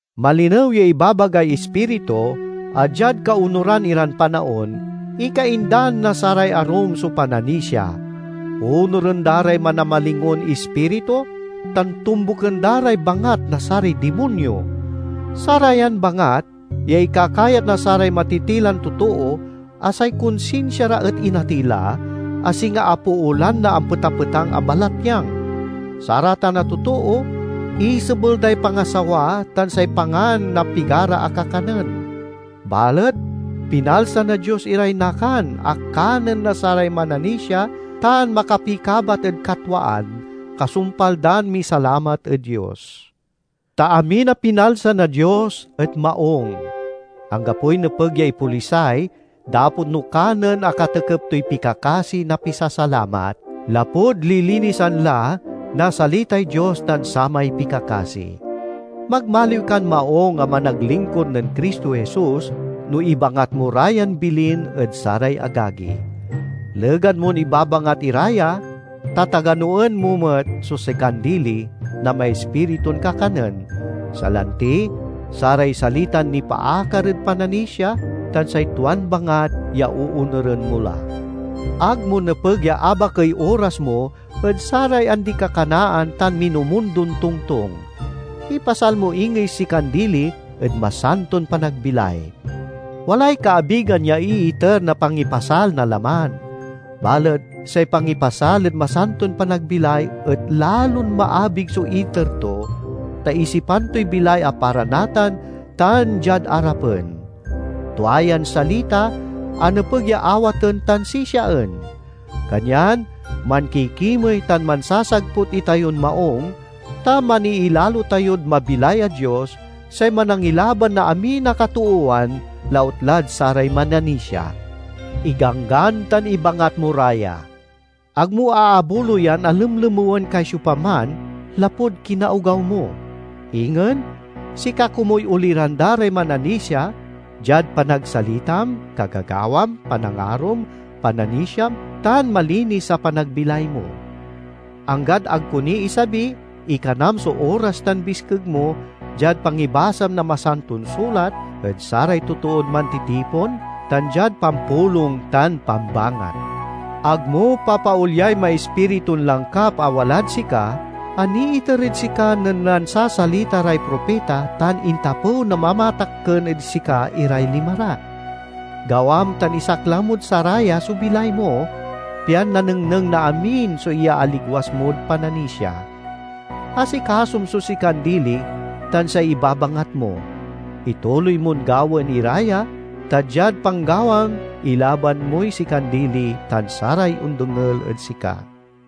Malinew ya ibabagay Ispiritu, a diad kaonuran iran panaon, ikaindan na saray arum so pananisia; onuren da ray manamalingon ispiritu tan tombuken da ray bangat na saray dimonyo. Sarayan bangat ya ikakayat na saray matitilan totoo a say konsinsia ra et inatey la, a singa apoolan na ampetapetang a balatyang. Saratan a totoo isebel day pangasawa tan say pangan na pigara a kakanen. Balet pinalsa na Dios iray nakan a kanen na saray mananisia tan makapikabat ed katwaan, kasumpal dan misalamat ed Dios. Ta amin a pinalsa na Dios et maung; anggapoy nepeg ya ipolisay dapot no kanen a katekep toy pikakasi na pisasalamat, lapud lilinisan la na salitay Dios tan samay pikakasi. Magmaliw kan maung a managlingkur nen Cristo Jesus no ibangat mo ra yan bilin ed saray agagi. Legan mon ibabangat ira ya, tataganoen mo met so sikan dili na maispiritun kakanen, salanti saray salitan nipaakar ed pananisia tan say tuan bangat ya oonuren mo la. Ag mo nepeg ya abakey oras mo ed saray andi-kakanaan tan minumundon tongtong. Ipasal mo ingey sikan dili ed masanton panagbilay. Walay kaabigan ya iiter na pangipasal na laman. Balet say pangipasal ed masanton panagbilay et lalon maabig so iter to, ta isipan toy bilay a para natan tan diad arapen. Tua yan salita a nepeg ya awaten tan sisiaen. Kanyan mankikimey tan mansasagput itayon maung, ta maniilalo tayod mabilay a Dios, say Manangilaban na amin a katoowan, lautlad saray mananisia. Iganggan tan ibangat mo ra ya. Ag mo aabuloyan a lemlemewen kay siopaman lapud kinaogaw mo. Ingen, sika komuy oliran da ray mananisia diad panagsalitam, kagagawam, panangarom, pananisiam, tan malinis a panagbilay mo. Anggad ag ko ni isabi, ikanam so oras tan biskeg mo diad pangibasam na Masanton Sulat ed saray totoon mantitipon, tan diad pampulong tan pambangat. Ag mo papaolyay maispiritun langkap a walad sika, a niiter ed sika nen nansasalita ray propita tan intapew na mamatakken ed sika iray lima ra. Gawam tan isaklang mod saraya so bilay mo, pian nanengneng na amin so iyaaligwas mod pananisia. Asikasom so sikan dili tan say ibabangat mo. Ituloy mon gawaen ira ya, ta diad panggawam ilaban moy sikan dili tan saray ondengel ed sika.